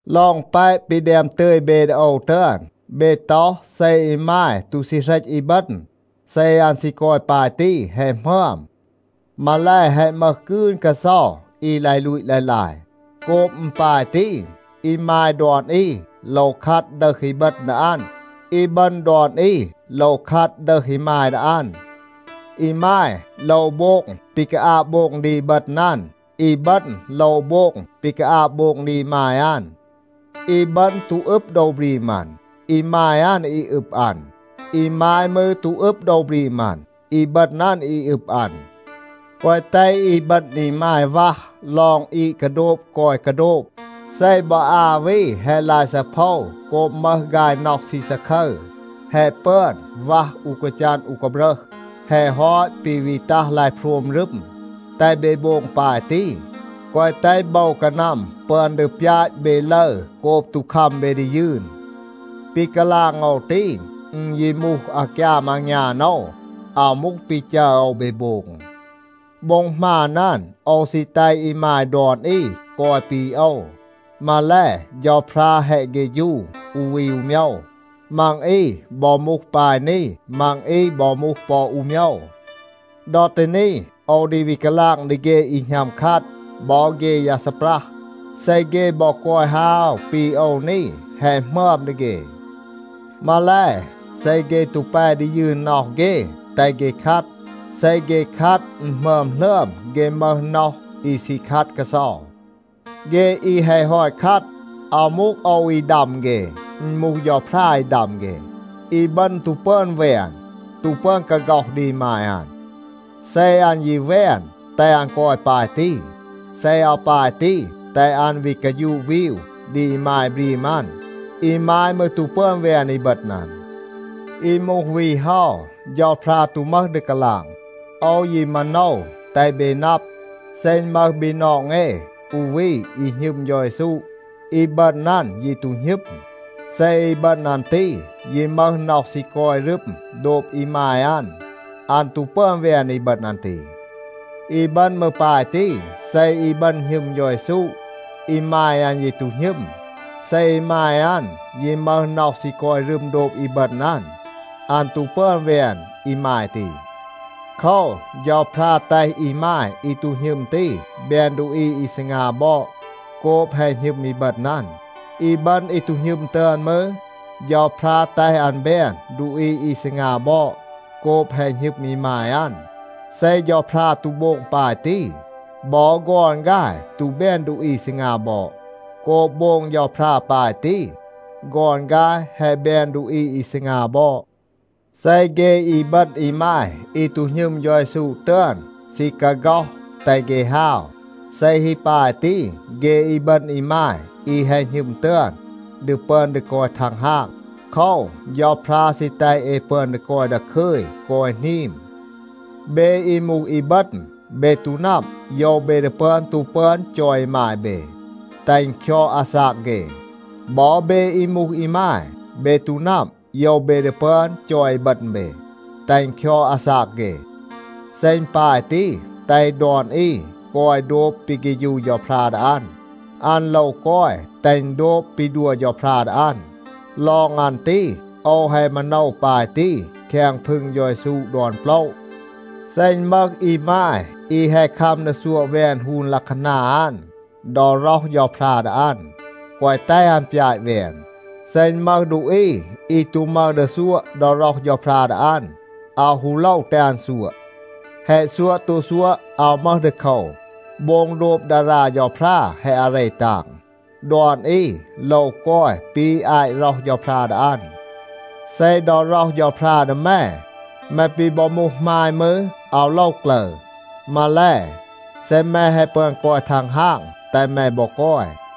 ลอง แปะ ปี แดม ตึย เบ ดี โอว ตึอน, เบ ต็อห, เซ อีมาย ตู ซี เหรต อีบึณ, เซ อัน ซี กอย ปาย ตี, แฮะ หมึอม. มาแล, แฮะ มึห กืน กาเซา อี ลาย ลูต ลาย ลาย. โกบ อึณ ปาย ตี, อีมาย ดอน อี โลว คัด ดึห อีบึณ ดี อัน. อีบึณ ดอน อี โลว คัด ดึห อีมาย ดี อัน. อีมาย โลว โบง ปี กาอาบ โบง ดี อีบึณ อัน. อีบึณ โลว โบง ปี กาอาบ โบง ดี อีมาย อัน. อีบึณ ตู อึบ โดว บรีม อัน. อีมาย อัน อี อึบ อัน. อีมาย มืร ตู อึบ โดว บรีม อัน. อีบึณ อัน อี อึบ อัน. แกวะ แตห อีบึณ อีมาย วัห ลอง อีด กาโดบ กอย กาโดบ. เซ บอ อา วี แฮะ ลาย ซีเพา โกบ มึห ฆาย น็อห ซี ซาคึร, แฮะ ปึอน วัห อู กาจัน อู กาบรึห, แฮะ ฮอต ปี วี ตัห ลาย โพรม รึม. แตห เบ โบง ปาย ตี, แกวะ แตห โบว กานัม ปึอน ดี ปยาต เบ ลึร โกบ ตู คัม เบ ดี ยืน. ปี กาลาง โอว ตี, อึณ ยี มูห อากยาม อางยาน โอว. อาว มูห ปี จัร โอว เบ โบง. โบ็ง หมาน อัน, โอว ซี แตห อีมาย ดอน อี กอย ปี โอว. มาแล, เฌาพรา แฮะ เฆฌู อู วี อู โมยว. มัง อี บอ มูห ปาย นี. มัง อี บอ มูห ปอ อู โมยว. ดอ ตี นี, โอว ดี วี กาลาง ดี เฆ อี หณัม คัด บอ เฆ ยา ซีปรัห, เซ เฆ บอ กอย ฮาว ปี โอว นี, แฮะ หมึอม ดี เฆ. มาแล, เซ เฆ ตู แป ดี ยืน น็อห เฆ, แตห เฆ คัด. เซ เฆ คัด อึณ หมึอม หลึอม เฆ มึห น็อห อี ซี คัด กาเซา. เฆ อี แฮะ ฮอต คัด, อาว มูห โอว อี ดัม เฆ. อึณ มูห เฌาพรา อี ดัม เฆ. อีบึณ ตู ปึอน แวน, ตู ปึอน กาฆ็อห ดี อีมาย อัน. เซ อัน ยี แวน, แตห อัน กอย ปาย ตี. เซ อาว ปาย ตี, แตห อัน วี กาฌูะ วีว ดี อีมาย บรีม อัน. อีมาย มืร ตู ปึอน แวน อีบึณ อัน. อี มูห วี เฮา, เฌาพรา ตู มึห ดี กาลาง. โอว ยี มาโนว แตห เบ นับ, เซ อึณ มึห บีนอง เอ อู วี อี หณึม เฌา เยซู, อีบึณ อัน ยี ตู หณึม, เซ อีบึณ อัน ตี ยี มึห น็อห ซี กอย รึม โดบ อีมาย อัน, อัน ตู ปึอน แวน อีบึณ อัน ตี. อีบึณ มืร ปาย ตี, เซ อีบึณ หณึม เฌา เยซู, อีมาย อัน ยี ตู หณึม. เซ อีมาย อัน ยี มึห น็อห ซี กอย รึม โดบ อีบึณ อัน, อัน ตู ปึอน แวน อีมาย ตี. โคว, เฌาพรา แตห อีมาย อี ตู หณึม ตี แบน ดูอี อี ซีงา บอด โกบ แฮะ หณึม อีบึณ อัน. อีบึณ อี ตู หณึม ตึอน มืร, เฌาพรา แตห อัน แบน ดูอี อี ซีงา บอด โกบ แฮะ หณึม อีมาย อัน. เซ เฌาพรา ตู โบง ปาย ตี, บอ ฆอน ฆาย ตู แบน ดูอี ซีงา บอด. โกบ โบง เฌาพรา ปาย ตี, ฆอน ฆาย แฮะ แบน ดูอี อี ซีงา บอด. เซ เฆ อีบึณ อีมาย อี ตู หณึม เฌา เยซู ตึอน ซี กาฆ็อห, แตห เฆ ฮาว. เซ ฮี ปาย ตี, เฆ อีบึณ อีมาย อี แฮะ หณึม ตึอน, ดี ปึอน ดี กอย ทังฮาง. โคว, เฌาพรา ซี แตห เอ ปึอน ดี กอย ดาคึย, กอย หนีม. เบ อี มูห อีบึณ, เบ ตู นับ, โยว เบ ดี ปึอน ตู ปึอน จอย อีมาย เบ, แตห อึณ คยอด อาซาก เฆ. บอ เบ อี มูห อีมาย, เบ ตู นับ, โยว เบ ดี ปึอน จอย อีบึณ เบ, แตห อึณ คยอด อาซาก เฆ. เซ อึณ ปาย ตี, แตห ดอน อี กอย โดบ ปี เฆฌู เฌาพรา ดี อัน. อัน โลว กอย แตห อึณ โดบ ปี ดัว เฌาพรา ดี อัน. ลอง อัน ตี, โอว แฮะ มาโนว ปาย ตี แคง พึง เฌา เยซู ดอน โปละ. เซ อึณ มึห อีมาย, อี แฮะ คัม ดี ซัวะ แวน ฮูน ลัะคานา อัน ดอ ร็อห เฌาพรา ดี อัน, แกวะ แตห อัน ปยาต แวน. เซ อึณ มึห ดูอี อี ตู มึห ดี ซัวะ ดอ ร็อห เฌาพรา ดี อัน, อาว ฮู โลว แตห อัน ซัวะ. แฮะ ซัวะ ตู ซัวะ, อาว มึห ดีโคว. โบง โดบ ดารา เฌาพรา แฮะ อาเร ตาง. ดอน อี โลว กอย ปี อาต ร็อห เฌาพรา ดี อัน. เซ ดอ ร็อห เฌาพรา ดี แม, แม ปี บอ มูห หมาย มืร, อาว โลว กลึร. มาแล, เซ แม แฮะ ปึอน กอย ทังฮาง, แตห แม บอ กอย.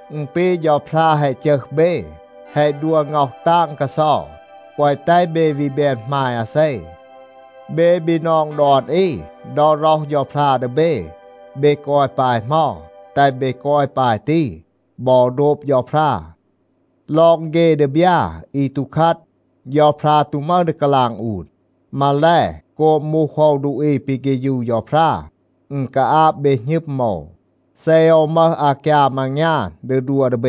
อึณ ปี เฌาพรา แฮะ จึห เบ, แฮะ ดัว ง็อห ตาง กาเซา. แกวะ แตห เบ วี แบน หมาย อาเซ. เบ บีนอง ดอน อี, ดอ ร็อห เฌาพรา ดี เบ, เบ กอย ปาย เหมา, แตห เบ กอย ปาย ตี บอ โดบ เฌาพรา. ลอง เฆ ดีบยา อี ตู คัด, เฌาพรา ตู มึห ดี กาลาง อูน. มาแล, โกบ มูห โอว ดูอี ปี เฆฌู เฌาพรา, อึณ กาอาบ เบ หณึม โอว, เซ โอว มึห อากยาม อางยาน ดี ดัว ดี เบ.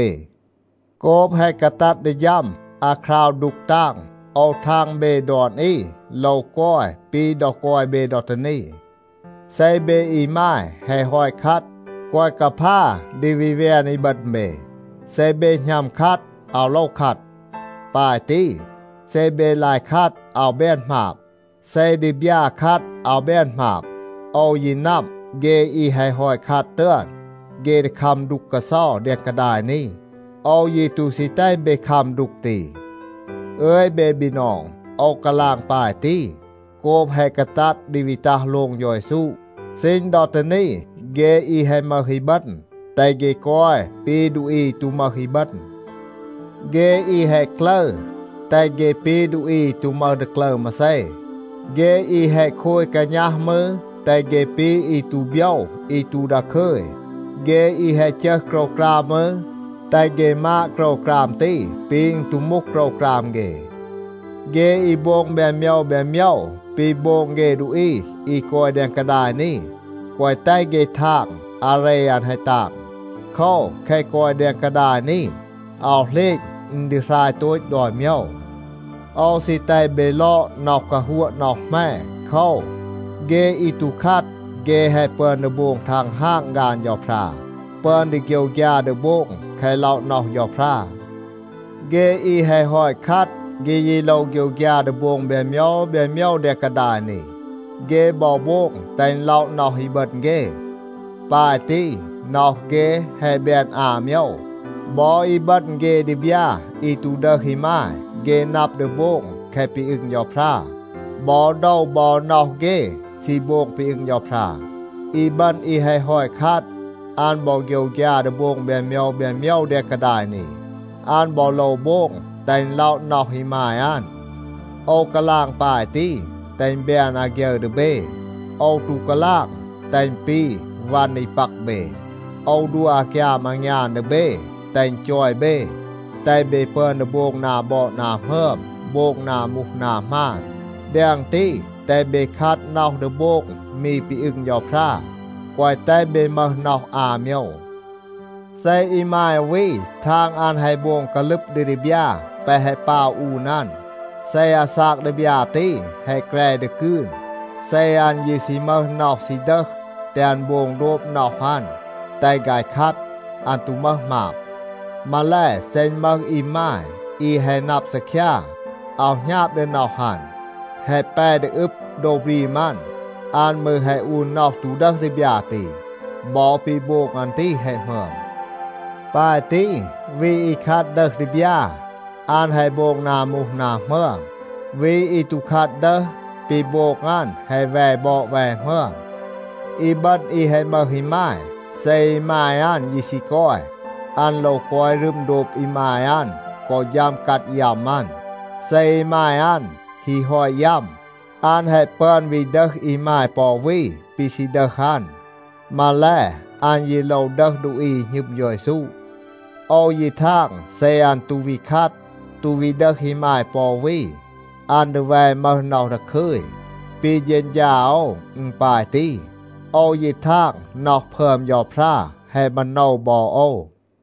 โกบ แฮะ กาตัด ดี ฌัม อาคราว ดูก ตาง, โอว ทาง เบ ดอน อี โลว กอย ปี ดอ กอย เบ ดอ ตี นี. เซ เบ อีมาย แฮะ ฮอต คัด, แกวะ กาพา ดี วี แวน อีบึณ เบ. เซ เบ หณัม คัด, อาว โลว คัด. ปาย ตี, เซ เบ ลาย คัด อาว แบน หมาบ. เซ ดีบยา คัด อาว แบน หมาบ. โอว ยี นับ, เฆ อี แฮะ ฮอต คัด ตึอน, เฆ ดี คัม ดูก กาเซา แดง กาดาย นี. โอว ยี ตู ซี แตห เบ คัม ดูก ตี. อึย เบ บีนอง, โอว กาลาง ปาย ตี, โกบ แฮะ กาตัด ดี วี ตัห โลง เฌา เยซู. ซีณ ดอ ตี นี, เฆ อี แฮะ มึห อีบึณ, แตห เฆ กอย ปี ดูอี อี ตู มึห อีบึณ. เฆ อี แฮะ กลึร, แตห เฆ ปี ดูอี อี ตู มึห ดี กลึร มาเซ. เฆ อี แฮะ โคย กาณัห มืร, แตห เฆ ปี อี ตู โบยว อี ตู ดาคึย. เฆ อี แฮะ จึห โกรวกราม มืร, แตห เฆ มาด โกรวกราม ตี ปี อึณ ตู มูห โกรวกราม เฆ. เฆ อี โบง แบน โมยว แบน โมยว ปี โบง เฆ ดูอี อี กอย แดง กาดาย นี, แกวะ แตห เฆ ทาง อาเร อัน แฮะ ตาง. โคว, แคะ กอย แดง กาดาย นี, อาว เหลณ อึณ ดี หราย โตต ดอน โมยว. โอว ซี แตห เบ ลอด น็อห กาฮัวะ น็อห แหม. โคว, เฆ อี ตู คัด, เฆ แฮะ ปึอน ดี โบง ทังฮาง ฆาน เฌาพรา, ปึอน ดี โฆยวฆยา ดี โบง แคะ ล็อะ น็อห เฌาพรา. เฆ อี แฮะ ฮอต คัด, เฆ ยี โลว โฆยวฆยา ดี โบง แบน โมยว แบน โมยว แดง กาดาย นี. เฆ บอ โบง แตห อึณ ล็อะ น็อห อีบึณ เฆ. ปาย ตี, น็อห เฆ แฮะ แบน อา โมยว. บอ อีบึณ เฆ ดีบยา อี ตู ดึห อีมาย, เฆ นับ ดี โบง แคะ ปี อึง เฌาพรา. บอ โดว บอ น็อห เฆ ซี โบง ปี อึง เฌาพรา. อีบึณ อี แฮะ ฮอต คัด, อัน บอ โฆยวฆยา ดี โบง แบน โมยว แบน โมยว แดง กาดาย นี. อัน บอ โลว โบง แตห อึณ ล็อะ น็อห อีมาย อัน. โอว กาลาง ปาย ตี, แตห อึณ แบน อาฆยึร ดี เบ. โอว ตู กาลาง, แตห อึณ ปี วัน อี ปัก เบ. โอว ดัว อากยาม อางยาน ดี เบ, แตห อึณ จอย เบ. แตห เบ ปึอน ดี โบง นา บอด นา หมึอม, โบง นา มูห นา หมาน. แดง ตี, แตห เบ คัด น็อห ดี โบง มี ปี อึง เฌาพรา. แกวะ แตห เบ มึห น็อห อา โมยว. เซ อีมาย อู วี ทาง อัน แฮะ โบง กาลึบ ดี ดีบยา แปะ แฮะ ปาว อูน อัน, เซ อาซาก ดีบยา ตี แฮะ แกร ดี กืน, เซ อัน ยี ซี มึห น็อห ซี ดึห, แตห อัน โบง โดบ น็อห อัน. แตห ฆาย คัด. อัน ตู มึห หมาบ. มาแล, เซ อึณ มึห อีมาย, อี แฮะ นับ ซีคยา, อาว หณาบ ดี น็อห อัน, แฮะ แป ดี อึบ โดว บรีม อัน, อัน มืร แฮะ อูน น็อห ตู ดึห ดีบยา ตี, บอ ปี โบง อัน ตี แฮะ หมึอม. ปาย ตี, วี อี คัด ดึห ดีบยา, อัน แฮะ โบง นา มูห นา หมึอม. วี อี ตู คัด ดึห, ปี โบง อัน แฮะ แว บอด แว หมึอม. อีบึณ อี แฮะ มึห อีมาย, เซ อีมาย อัน ยี ซี กอย, อัน โลว กอย รึม โดบ อีมาย อัน กอ ฌัม กัด ยัม อัน. เซ อีมาย อัน ฮี ฮอต ยัม, อัน แฮะ ปึอน วี ดึห อีมาย ปอ อู วี ปี ซี ดึห อัน. มาแล, อัน ยี โลว ดึห ดูอี อี หณึม เฌา เยซู. โอว ยี ทาง, เซ อัน ตู วี คัด, ตู วี ดึห อีมาย ปอ อู วี, อัน ดี แว มึห น็อห ดาคึย. ปี เฌณฌา โอว, อึณ ปาย ตี. โอว ยี ทาง, น็อห พึอม เฌาพรา แฮะ มาโนว บอ โอว.